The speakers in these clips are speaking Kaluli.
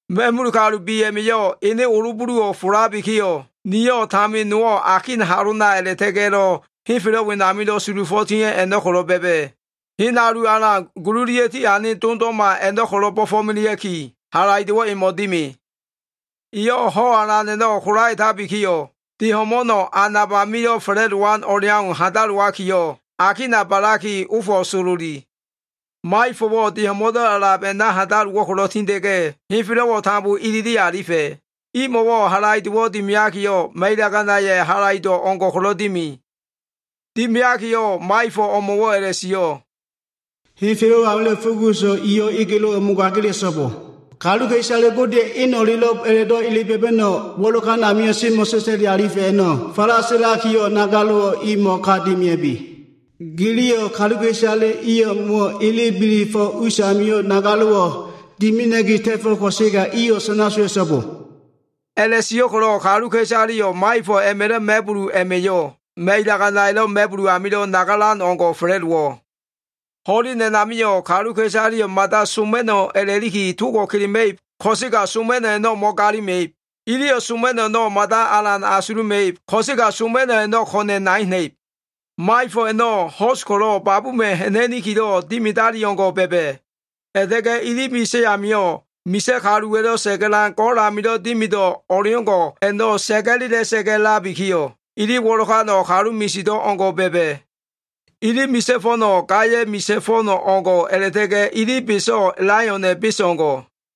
Ma꞉mul kalu bi a꞉ma꞉yo꞉ ene olo buluwo꞉ folabikiyo꞉, niyo꞉ tamin nowo꞉ akin halona a꞉la꞉ta꞉ga꞉lo꞉ henfelo꞉wa sulufo꞉ tia꞉ a꞉no꞉ ko꞉lo꞉ ba꞉ba꞉. Hen alu alan gululia꞉ tiane dondo꞉ma a꞉no꞉ ko꞉lo꞉ bo꞉fo꞉melea꞉ki, halaido꞉wo꞉ emo꞉wo꞉ dimi. Eyo꞉ hen alu alan a꞉no꞉ kolaetabikiyo꞉, de ho꞉mo꞉no꞉, a nab amilo꞉ fa꞉la꞉dowan o꞉leau handalowakiyo꞉, akina ba꞉laki ofo꞉ sololi. Maifo꞉wo꞉ de ho꞉mo꞉ndo꞉ a꞉lab a꞉na handalowo꞉ ko꞉lo꞉ tinda꞉ga꞉, henfelo꞉wo꞉ tambo ilili alifa꞉. Imo꞉wo꞉ halaido꞉wo꞉ dimiakiyo꞉, ma꞉ilaganaya꞉ halaido꞉ o꞉ngo꞉ ko꞉lo꞉ dimi. Dimiakiyo꞉, maifo꞉ o꞉mo꞉wo꞉ a꞉la꞉sio꞉, “Henfelo꞉ amilo꞉ fuguso꞉, iyo꞉, egelo꞉wo꞉ mogagila꞉so꞉bo. Kaluka꞉isale Godeya꞉ eno꞉lelo꞉b a꞉la꞉do꞉ ele ba꞉ba꞉no꞉wo꞉ wo꞉lokan amio꞉ mo꞉sa꞉sa꞉li alifa꞉ a꞉no꞉ falasilakiyo꞉, nagalo꞉wo꞉ imo꞉ ka dimia꞉bi. Giliyo꞉ kaluka꞉isale i o꞉mo꞉wo꞉ ele bila꞉fo꞉ usamio꞉ nagalo꞉wo꞉ dimina꞉ki ta꞉fo꞉ ko꞉sega, iyo꞉ sana sowa꞉so꞉bo.” A꞉la꞉sio꞉ ko꞉lo꞉ kaluka꞉isaleyo꞉ maifo꞉ a꞉ma꞉lo꞉ ma꞉bulab a꞉ma꞉yo꞉, ma꞉ilaganaya꞉lo꞉ ma꞉bulu amilo꞉ nagalan o꞉ngo꞉ fa꞉la꞉dowo꞉. Ho꞉len a꞉namio꞉ kaluka꞉isaleyo꞉ mada soma꞉no꞉ a꞉la꞉liki togo꞉ kelema꞉ib ko꞉sega soma꞉no꞉ a꞉no꞉ mo꞉galima꞉ib. Iliyo꞉ soma꞉no꞉ a꞉no꞉ mada alan asuluma꞉ib, ko꞉sega soma꞉no꞉ a꞉no꞉ ko꞉na꞉ nai ha꞉na꞉ib. Maifo꞉ a꞉no꞉ ho꞉s ko꞉lo꞉ babuma꞉ ha꞉na꞉nikilo꞉ dimidali o꞉ngo꞉ ba꞉ba꞉. A꞉la꞉ta꞉ga꞉ ili misa꞉ amio꞉, misa꞉ kaluwa꞉lo꞉ sa꞉ga꞉lan go꞉l amilo꞉ dimido꞉ o꞉leo꞉ngo꞉ a꞉no꞉ sa꞉ga꞉la꞉sa꞉ga꞉ a꞉labikiyo꞉, ili wo꞉lokano꞉ kalu misido꞉ o꞉ngo꞉ ba꞉ba꞉. Ili misa꞉ fo꞉no꞉, gaya꞉ misa꞉ fo꞉n o꞉ngo꞉ a꞉la꞉ta꞉ga꞉ ili beso꞉ laiona꞉ bes o꞉ngo꞉.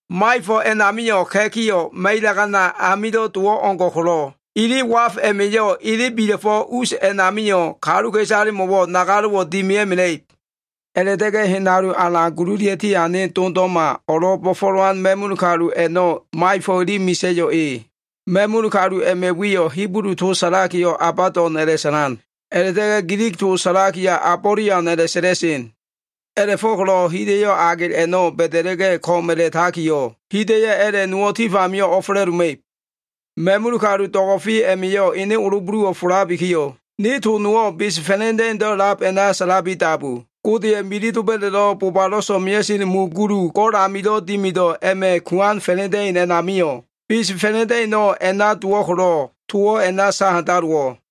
Maifo꞉ a꞉namio꞉ ka꞉kiyo꞉ ma꞉ilagana amilo꞉ dowo꞉ o꞉ngo꞉ ko꞉lo꞉, ili waf a꞉ma꞉yo꞉ ele bila꞉fo꞉ us a꞉namio꞉ kaluka꞉isalemo꞉wo꞉ nagalo꞉wo꞉ dimia꞉mela꞉ib. A꞉la꞉ta꞉ga꞉ hen alu alan gululia꞉ tiane dondo꞉ma o꞉lo꞉ bo꞉fo꞉lowan ma꞉mul kalu a꞉no꞉, maifo꞉ ili misa꞉yo꞉ e. Ma꞉mul kalu a꞉ma꞉ wiyo꞉ Hibulu to sa꞉lakiyo꞉ Abadon a꞉la꞉sa꞉lan. A꞉la꞉ta꞉ga꞉ Gilig to sa꞉lakiyo꞉ Abolian a꞉la꞉sa꞉la꞉sen. A꞉la꞉fo꞉ko꞉lo꞉ hida꞉yo꞉ agel a꞉no꞉ ba꞉da꞉la꞉ga꞉ ko꞉m a꞉la꞉takiyo꞉, hida꞉yo꞉ a꞉la꞉ nowo꞉ tif amio꞉ o꞉fa꞉la꞉doma꞉ib. Ma꞉mul kalu do꞉go꞉fe a꞉ma꞉yo꞉ ene olo buluwo꞉ folabikiyo꞉, ne to nowo꞉ bes fa꞉la꞉da꞉indo꞉ a꞉lab, a꞉na sa꞉labi dabu. Godeya꞉ milif doba꞉da꞉lo꞉ bobalo꞉ so꞉mea꞉sen mu gulu go꞉l amilo꞉ dimido꞉ a꞉ma꞉ kuan fa꞉la꞉da꞉in a꞉namio꞉, bes fa꞉la꞉da꞉ino꞉ a꞉na dowo꞉ ko꞉lo꞉, towo꞉ a꞉na sa handalowo꞉.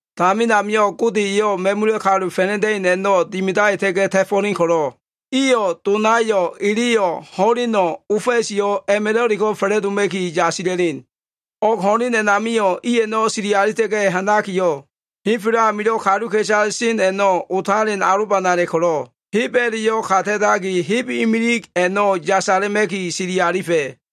Tamin amio꞉ Gode eyo꞉ ma꞉mula꞉ kalu fa꞉la꞉da꞉in i a꞉no꞉ dimidaita꞉ga꞉ ta꞉fo꞉len ko꞉lo꞉, iyo꞉ donayo꞉, eleyo꞉, ho꞉leno꞉, ofa꞉si a꞉ma꞉lo꞉leko꞉ fa꞉la꞉doma꞉ki yasila꞉len. O꞉g ho꞉len a꞉namio꞉ i a꞉no꞉ sili alita꞉ga꞉ ha꞉nakiyo꞉, henfelo꞉ amilo꞉ kaluka꞉isale sen a꞉no꞉ otalen alobanala꞉ ko꞉lo꞉, heb a꞉la꞉yo꞉ ka ta꞉taki, heb imilig a꞉no꞉ yasala꞉ma꞉ki sili alifa꞉.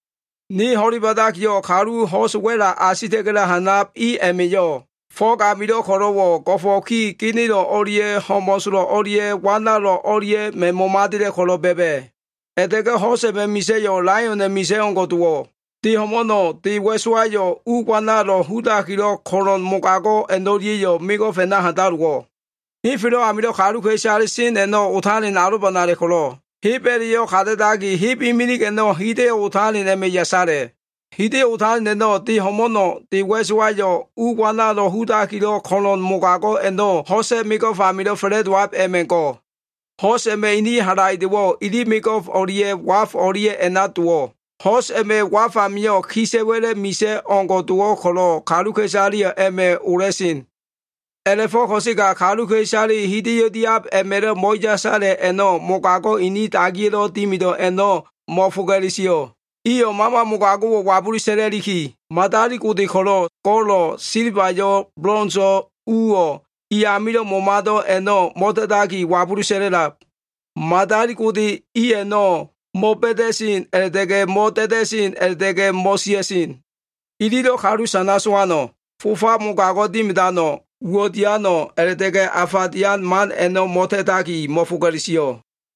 Ne ho꞉le ba꞉dakiyo꞉, kalu ho꞉s wa꞉la asita꞉ga꞉lo꞉ ha꞉nab i a꞉ma꞉yo꞉ fo꞉g amilo꞉ ko꞉lo꞉wo꞉ go꞉fo꞉ ki genelo꞉ o꞉lia꞉ ho꞉mo꞉solo꞉ o꞉lia꞉ wanalo꞉ o꞉lia꞉ma꞉ momadela꞉ ko꞉lo꞉ ba꞉ba꞉. A꞉la꞉ta꞉ga꞉ ho꞉s a꞉ma꞉ misa꞉yo꞉ laiona꞉ misa꞉yo꞉ o꞉ngo꞉ dowo꞉. De ho꞉mo꞉no꞉, de wa꞉sowayo꞉, u wanalo꞉ hudakilo꞉ ko꞉lo꞉n mogago꞉ a꞉no꞉lia꞉yo꞉ mego꞉f a꞉na handalowo꞉. Henfelo꞉ amilo꞉ kaluka꞉isale sen a꞉no꞉ otalen alobanala꞉ ko꞉lo꞉, heb a꞉la꞉yo꞉ ka ta꞉taki, heb imilig a꞉no꞉, hida꞉yo꞉ otalen a꞉ma꞉ yasala꞉. Hida꞉yo꞉ otalen a꞉no꞉, de ho꞉mo꞉no꞉, de wa꞉sowayo꞉, u wanalo꞉ hudakilo꞉ ko꞉lo꞉n mogago꞉ a꞉no꞉ ho꞉sa꞉ mego꞉f amilo꞉ fa꞉la꞉dowab a꞉ma꞉ go꞉. Ho꞉s a꞉ma꞉ ini halaido꞉wo꞉ ili mego꞉f o꞉lia꞉ waf o꞉lia꞉ a꞉na dowo꞉. Ho꞉s a꞉ma꞉ waf amio꞉, kisa꞉wa꞉la꞉ misa꞉ o꞉ngo꞉ dowo꞉ ko꞉lo꞉, kaluka꞉isaleyo꞉ a꞉ma꞉ ola꞉sen. A꞉la꞉fo꞉ ko꞉sega kaluka꞉isaleyo꞉ hida꞉yo꞉ diab a꞉ma꞉lo꞉ mo꞉yasala꞉ a꞉no꞉ mogago꞉ inin dagiya꞉lo꞉ dimido꞉ a꞉no꞉ mo꞉foga꞉le sio꞉. Iyo꞉ mama mogago꞉wo꞉ wabulu sa꞉la꞉liki, madali gode go꞉lo꞉, silbayo꞉, bolonso꞉, uwo꞉, i amilo꞉ momado꞉ a꞉no꞉ mo꞉ta꞉taki, wabulu sa꞉la꞉lab. Madali gode i a꞉no꞉ mo꞉ba꞉da꞉sen a꞉la꞉ta꞉ga꞉, mo꞉da꞉da꞉sen a꞉la꞉ta꞉ga꞉ mo꞉sia꞉sen. Ililo꞉ kalu sana sowano꞉, fofa mogago꞉ dimidano꞉, uwo꞉ diano꞉ a꞉la꞉ta꞉ga꞉ afa dian man a꞉no꞉ ta꞉takiyo꞉ mo꞉foga꞉le sio꞉.